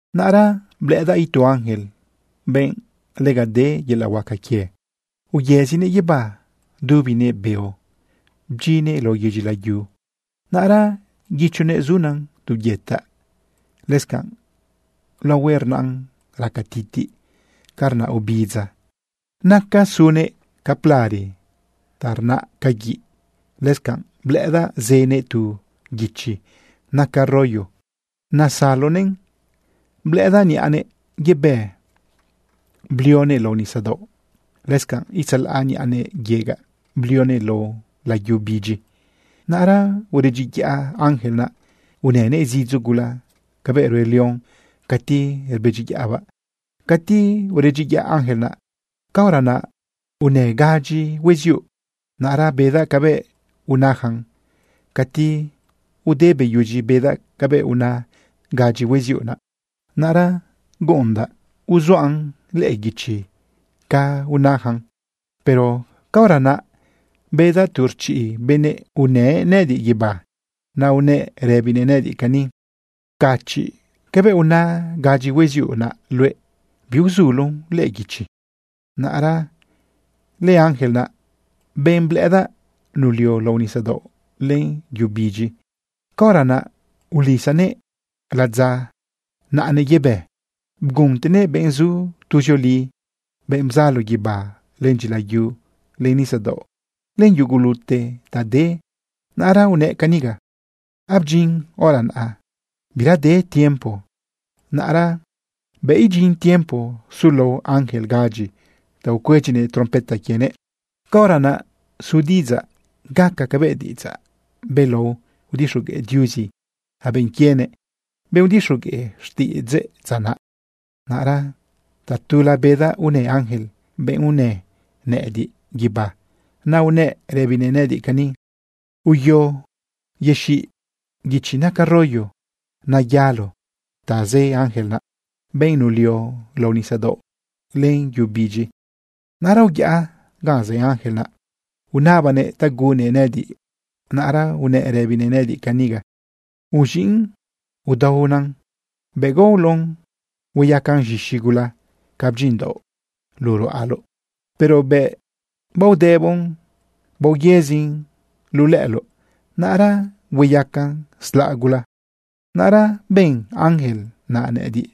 Naꞌra blëꞌëdaꞌ itu ángel, benꞌ lega de yelaꞌ huaca quie. Uyëzinëꞌ guibá dubinëꞌ beo bdyinnëꞌ lao yedyi layu. Naꞌra guichonëꞌ zunan tu byetaꞌ. Lëscanꞌ laohuëꞌ rnaꞌn raca titiꞌ ca rnaꞌ ubidza. Naca sunnëꞌ ca plare ta rnaꞌ ca guiꞌ. Lëscanꞌ blëꞌëdaꞌ zënëꞌ tu guichi naca rollo nasalonëꞌn. Blëꞌëdaꞌ niꞌanëꞌ yebë blionëꞌ lao nisadaoꞌ. Lëscanꞌ itzalaꞌ niꞌanëꞌ yegaꞌ blionëꞌ lao yu bidyi. Naꞌra uredyiyaꞌ ángel naꞌ unënëꞌ zidzo gula cabëꞌ rue león cati rbedyiyaꞌbaꞌ. Cati uredyiyaꞌ ángel naꞌ, caora naꞌ unë gadyi hueziuꞌ. Naꞌra bedaꞌ cabëꞌ unajan. Cati ude beyudyi bedaꞌ cabëꞌ una gadyi hueziuꞌ naꞌ, naꞌra gueꞌendaꞌ uzuaꞌn lëꞌë guichi ca unajan. Pero caora naꞌ bedaꞌ tu rchiꞌ benꞌ unë nëꞌëdiꞌ guibá. Naꞌ unëꞌ rëbinëꞌ nëꞌëdiꞌ cani: ―Pcachiꞌ cabëꞌ una gadyi hueziuꞌ naꞌ luëꞌ. Biuzuloꞌn lëꞌë guichi. Naꞌra lëángel naꞌ, benꞌ blëꞌëdaꞌ nulio lao nisadaoꞌ len yu bidyi, caora naꞌ ulisanëꞌ ladza naꞌanëꞌ yebë bguntenëꞌ benꞌ zu tuzioli, benꞌ bzalo guibá, len dyilayu, len nisadaoꞌ, len yugulute ta de. Naꞌra unëꞌ caniga: ―Abdyin hora naꞌa. Bira de tiempo. Naꞌra bëꞌ idyin tiempo sulao ángel gadyi ta ucuedyinëꞌ trompeta quienëꞌ, caora naꞌ su diꞌidzaꞌ gaca cabëꞌ diꞌidzaꞌ belao udixogueꞌ Diuzi ja benꞌ quienëꞌ, benꞌ udixogueꞌ xtiꞌidzëꞌ dza naꞌ. Naꞌra tatula bedaꞌ unë ángel, benꞌ unë nëꞌëdiꞌ guibá. Naꞌ unëꞌ rëbinëꞌ nëꞌëdiꞌ cani: ―Uyo yexiꞌ guichi naca rollo nayalo ta zë ángel naꞌ, benꞌ nulio lao nisadaoꞌ len yu bidyi. Naꞌra uyaꞌ ganꞌ zë ángel naꞌ, unabaꞌnëꞌ ta gunnëꞌn nëꞌëdiꞌ. Naꞌra unëꞌ rëbinëꞌ nëꞌëdiꞌ caniga: ―Uz̃iꞌn, udaona. Bëꞌ gaoloꞌn hueyacan z̃ixi gula ca bdyinꞌdaoꞌ luꞌu ruꞌaloꞌ. Pero bëꞌ baodëboꞌn baoyëzin luꞌu lëꞌëloꞌ, naꞌra hueyacan slaꞌ gula. Naꞌra ben ángel naꞌ nëꞌëdiꞌ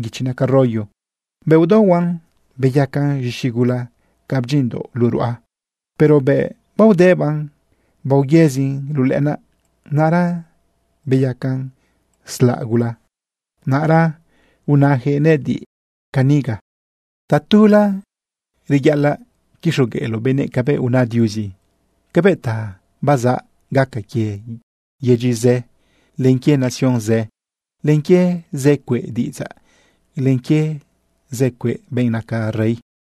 guichi naca rollo. Bëꞌ udaohuaꞌn beyacan z̃ixi gula ca bdyinꞌdaoꞌ luꞌu ruꞌa. Pero bëꞌ baodëbaꞌn baoyëzin luꞌu lëꞌënaꞌ, naꞌra beyacan slaꞌ gula. Naꞌra unajëꞌ nëꞌëdiꞌ caniga: ―Tatula reyaꞌalaꞌ quixogueꞌloꞌ benëꞌ cabëꞌ una Diuzi cabëꞌ ta bazaꞌ gaca quie yedyi zë, len quie nación zë, len quie zë cueꞌ diꞌidzaꞌ, len quie zë cueꞌ benꞌ naca rey.